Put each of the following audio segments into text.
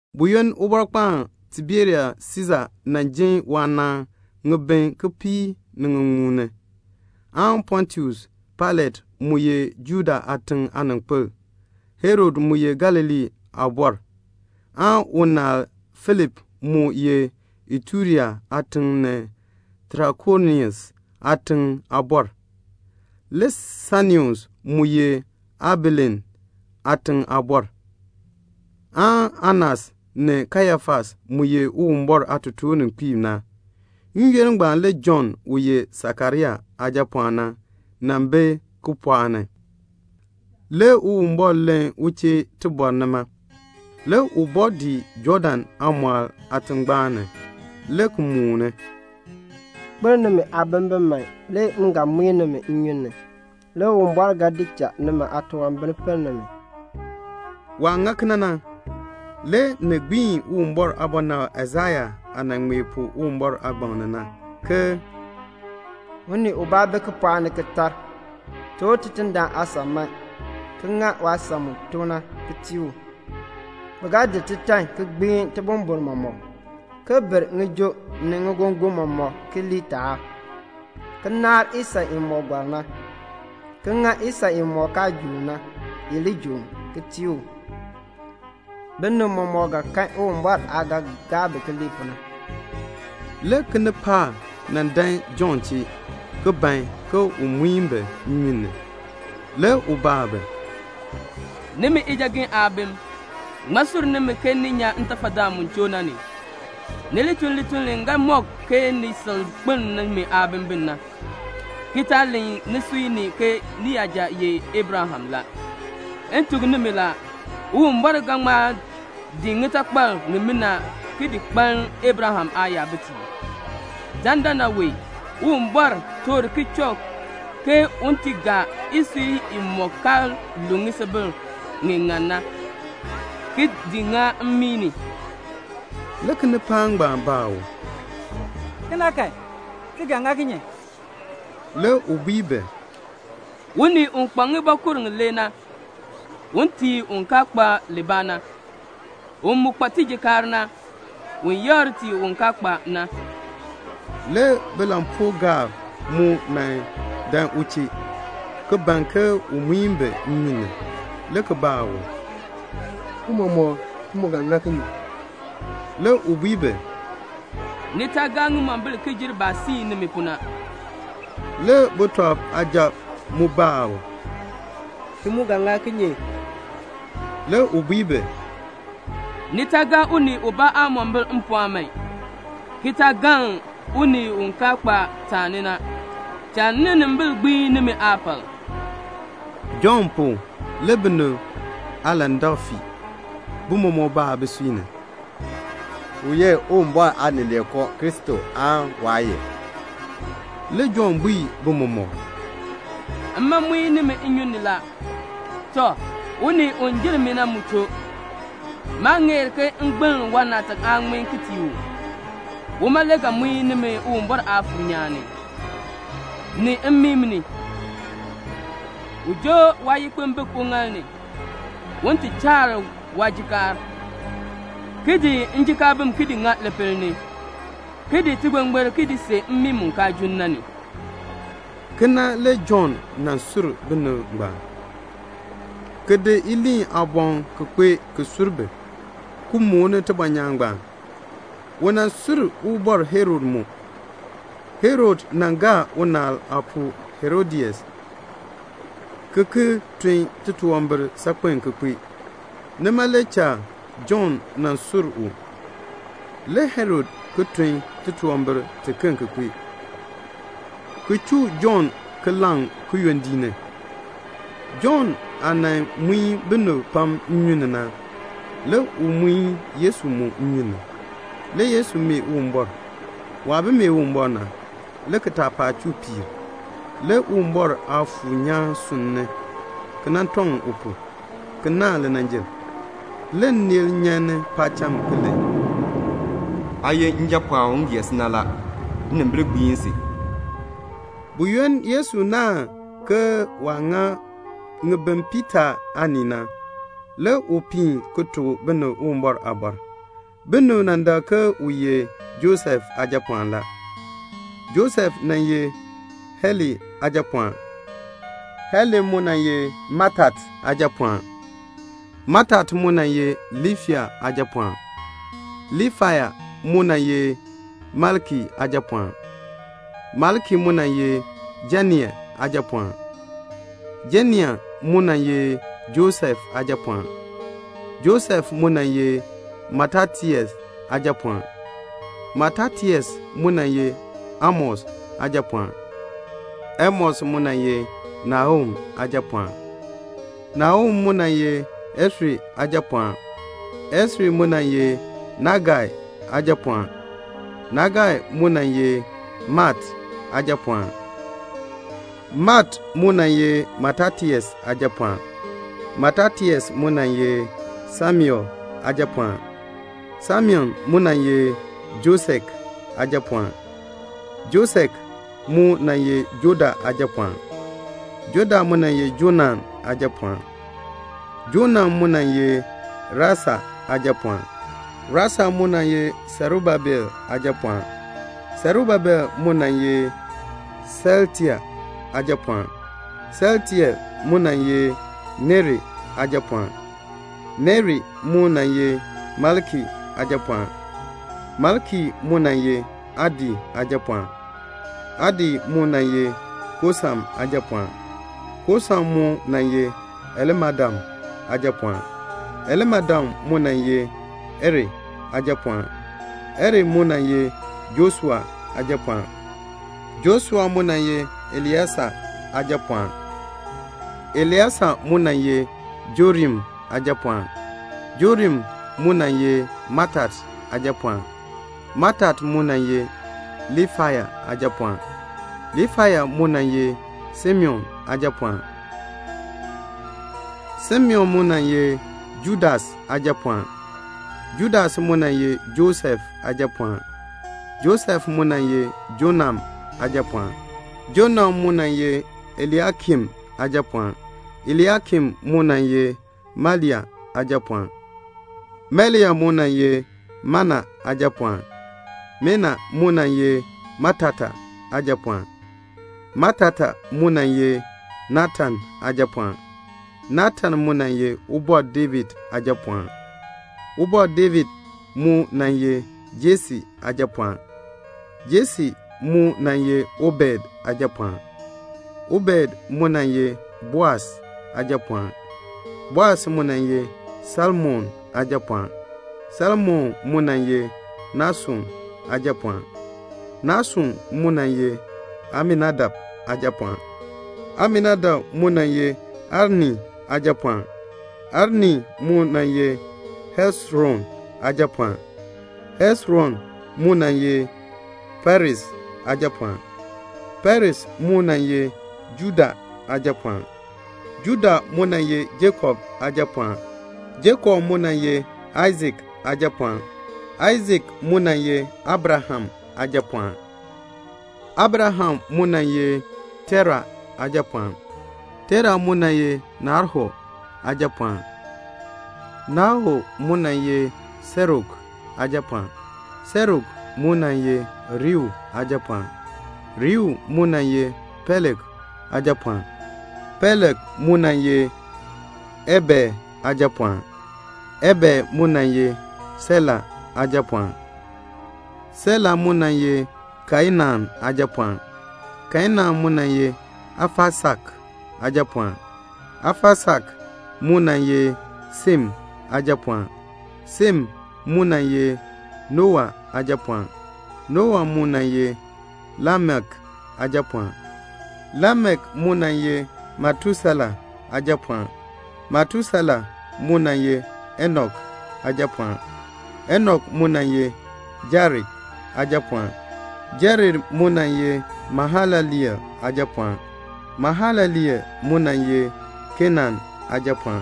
Buyoonn Ubɔrkpaan Tiberius Siisa nan jin waanaan ŋibin kipiik ni ŋiŋmu, Pontius Pailat mu ye Judea aatiŋ aaninkpil, Herod mu ye Galilee aabɔr, unaal Filip mu ye Iturea aatiŋ ni Trakonitis aatiŋ aabɔr, Lisanius mu ye Abilene aatiŋ aabɔr, Anas ni Kayafas mu ye Uwumbɔr aatotoorninkpiib, n-yoonn ngbaan le Jɔnn u ye Sakaria aajapɔɔn na bi kipɔɔk ni. Le Uwumbɔr len u chee nima. Le u bɔɔ dii Jɔɔdan aamɔɔl aatingbaan, le ki mooni, "Kpeln nimi aabimbin man, le m ga muin nimi nnyun ni, le Uwumbɔr ga di cha nimi aatunwambir pinn nimi." Waah ŋa kena na, le ni gbiin Uwumbɔr aabɔnabr Aisaya aah nan ŋmee pu Uwumbɔr aagbaŋ ni na, ke "Unii ubaa bi kipɔɔk ni ki tar, 'Toor Tidindaan aasan man ki ŋa waasan mu tok na ki tii u. Bi ga di titan ki gbiin tibumbuln mɔmɔk, ki ber ŋijoo ni ŋigongon mɔmɔk ki lii taab, ki naar isan imɔk gɔr na, ki ŋa isan imɔk kaa joon na, i li joon, ki tii u. Binib mɔmɔk ga kan Uwumbɔr aah ga gaa bi ke bi ŋmar na."' Le kinipaak nan dan Jɔnn chee, ki ban ke un muin bi nnyun ni. Le u baa bi, "Nimi ijagen aabim, ŋmaa sur nimi ke ni li nyan ntafadaan mu choo na ni? Ni li tun lituln li ga mɔk ke ni sil kpeln nimi aabimbin na, ki taa len nisui ni ke niyaja ye Abraham la. M tuk nimi la, Uwumbɔr ga ŋma di ŋitakpal ŋimina ki di kpaln Abraham aayabitiib. Dandana wee Uwumbɔr toor kichɔk ke un ti gaa isui imɔk kaa lu ŋisubil ŋi ŋan na, ki di ŋa mmii ni." Le kinipaak ngbaan baa u, "Kena kan, ti ga ŋa kinye?" Le u bui bi, "Unii u kpa ŋibɔkur ŋilee na, un tii un kaa kpa libaa na. U mu kpa tijikaar na, un yakr tii un kaa kpa na." Le bilampuugaab mu dan u chee, ki ban ke un muin bi nnyun ni, le ki baa u, "Tiicha, ti mu ga ŋa kinye?" Le u bui bi, "Ni taa gaa ŋimombil ki jer baah siin nimi pu na." Le sujatiib mu baa u, "Ti mu ga ŋa kinye?" Le u bui bi, "Ni taa gaa unii ubaa aamombil mpɔɔn man, ki taa galn unii u kaa kpa taani na. Cha ninimbil gbiin nimi aapal." Jɔnn pu, le binib aalandak fii. Bi mɔmɔk baa bisui ni, "U ye Uwumbɔr Aanileekoo Kristo aan waa ye?" Le Jɔnn bui bi mɔmɔk, "Mma muin nimi nnyun ni la. Le unii u jer mi na mu choo. Maa ŋeer ke m gbiln waanaatak aaŋmin ki tii u. Uma le ga gbiin nimi ngem Uwumbɔr Aafuur nyaan, ki daa nimi ngem aatafal mmii ni. U joo waayikpimbik uŋaal ni, un ti chaar waajikaar, ki di njikaabim ki di ŋa lipil ni, ki di tigbingbir ki di see mmii mu kaan junn na ni." Kena le Jɔnn sur binib ngbaan, ki di iliin aaboŋ ki kpee ki sur bi, ki mooni tibɔnyaan ngbaan. U sur Ubɔr Herod mu. Herod joo unaal aapuu Herodias, ki ki tun titunwambir saakpen ki kpee. Nima le cha Jɔnn sur u. Le Herod ki tun titunwambir ki kpee tiken pu, ki chuu Jɔnn ki laŋ kiyondiik ni. Jɔnn aah nan muin binib pam nnyun ni na, le u muin Yesu mu nnyun ni. Le Yesu mee Uwumbɔr. Waah bi mee Uwumbɔr na, le kitaapaak chuu piir. Le Uwumbɔr Aafuur nyaan sunn ni, ki nan tɔŋ u pu, ki naahn linanjil. Le nneel nyan ni paacham ki len, "Aa ye Njapɔɔn u m gee si na. Le nnimbil gbiin si." Buyoonn Yesu naahn ŋibin piitaa aanii na, le u piin ki tuk binib Uwumbɔr aaliin. Binib dak ke u ye Josef aajapɔɔn la. Josef nan ye Heli aajapɔɔn, Heli mu nan ye Matat aajapɔɔn, Matat mu nan ye Liifai aajapɔɔn, Liifai mu nan ye Melki aajapɔɔn, Melki mu nan ye Janai aajapɔɔn, Janai mu nan ye Josef aajapɔɔn, Josef mu nan ye Matatias aajapɔɔn, Matatias mu nan ye Amos aajapɔɔn, Amos mu nan ye Nahum aajapɔɔn, Nahum mu nan ye Esri aajapɔɔn, Esri mu nan ye Nagai aajapɔɔn, Nagai mu nan ye Maat aajapɔɔn, Maat mu nan ye Matatias aajapɔɔn, Matatias mu nan ye Semein aajapɔɔn, Semein mu nan ye Josek aajapɔɔn, Josek mu nan ye Joda aajapɔɔn, Joda mu nan ye Joanan aajapɔɔn, Joanan mu nan ye Resa aajapɔɔn, Resa mu nan ye Serubabel aajapɔɔn, Serubabel mu nan ye Shealtiel aajapɔɔn, Shealtiel mu nan ye Neri aajapɔɔn, Neri mu nan ye Melki aajapɔɔn, Melki mu nan ye Adi aajapɔɔn, Adi mu nan ye Kosam aajapɔɔn, Kosam mu nan ye Elmadam aajapɔɔn, Elmadam mu nan ye Er aajapɔɔn, Er mu nan ye Joshua aajapɔɔn, Joshua mu nan ye Elieser aajapɔɔn, Elieser mu nan ye Jorim aajapɔɔn, Jorim mu nan ye Matat aajapɔɔn, Matat mu nan ye Liifai aajapɔɔn, Liifai mu nan ye Simeon aajapɔɔn, Simeon mu nan ye Judas aajapɔɔn, Judas mu nan ye Josef aajapɔɔn, Josef mu nan ye Jonam aajapɔɔn, Jonam mu nan ye Eliakim aajapɔɔn, Eliakim mu nan ye Melea aajapɔɔn, Melea mu nan ye Mena aajapɔɔn, Mena mu nan ye Matata aajapɔɔn, Matata mu nan ye Natan aajapɔɔn, Natan mu nan ye Ubɔr David aajapɔɔn, Ubɔr David mu nan ye Jese aajapɔɔn, Jese mu nan ye Obed aajapɔɔn, Obed mu nan ye Boas aajapɔɔn, Boas mu nan ye Salmon aajapɔɔn, Salmon mu nan ye Nashon aajapɔɔn, Nashon mu nan ye Aminadab aajapɔɔn, Aminadab mu nan ye Arni aajapɔɔn, Arni mu nan ye Hesron aajapɔɔn, Hesron mu nan ye Peres aajapɔɔn, Peres mu nan ye Juda aajapɔɔn, Juda mu nan ye Jakob aajapɔɔn, Jakob mu nan ye Aisak aajapɔɔn, Aisak mu nan ye Abraham aajapɔɔn, Abraham mu nan ye Tera aajapɔɔn, Tera mu nan ye Nahor aajapɔɔn, Nahor mu nan ye Serug aajapɔɔn, Serug mu nan ye Reu aajapɔɔn, Reu mu nan ye Peleg aajapɔɔn, Peleg mu nan ye Eber aajapɔɔn, Eber mu nan ye Shela aajapɔɔn, Shela mu nan ye Kainann aajapɔɔn, Kainann mu nan ye Afaksad aajapɔɔn, Afaksad mu nan ye Shem aajapɔɔn, Shem mu nan ye Nowa aajapɔɔn, Nowa mu nan ye Lamek aajapɔɔn, Lamek mu nan ye Metusela aajapɔɔn, Metusela mu nan ye Enok aajapɔɔn, Enok mu nan ye Jared aajapɔɔn, Jared mu nan ye Mahalaleel aajapɔɔn, Mahalaleel mu nan ye Kenann aajapɔɔn,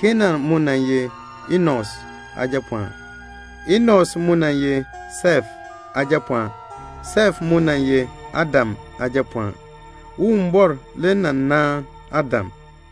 Kenann mu nan ye Enos aajapɔɔn, Enos mu nan ye Sef aajapɔɔn, Sef mu nan ye Adam aajapɔɔn, Uwumbɔr le nan naan Adam.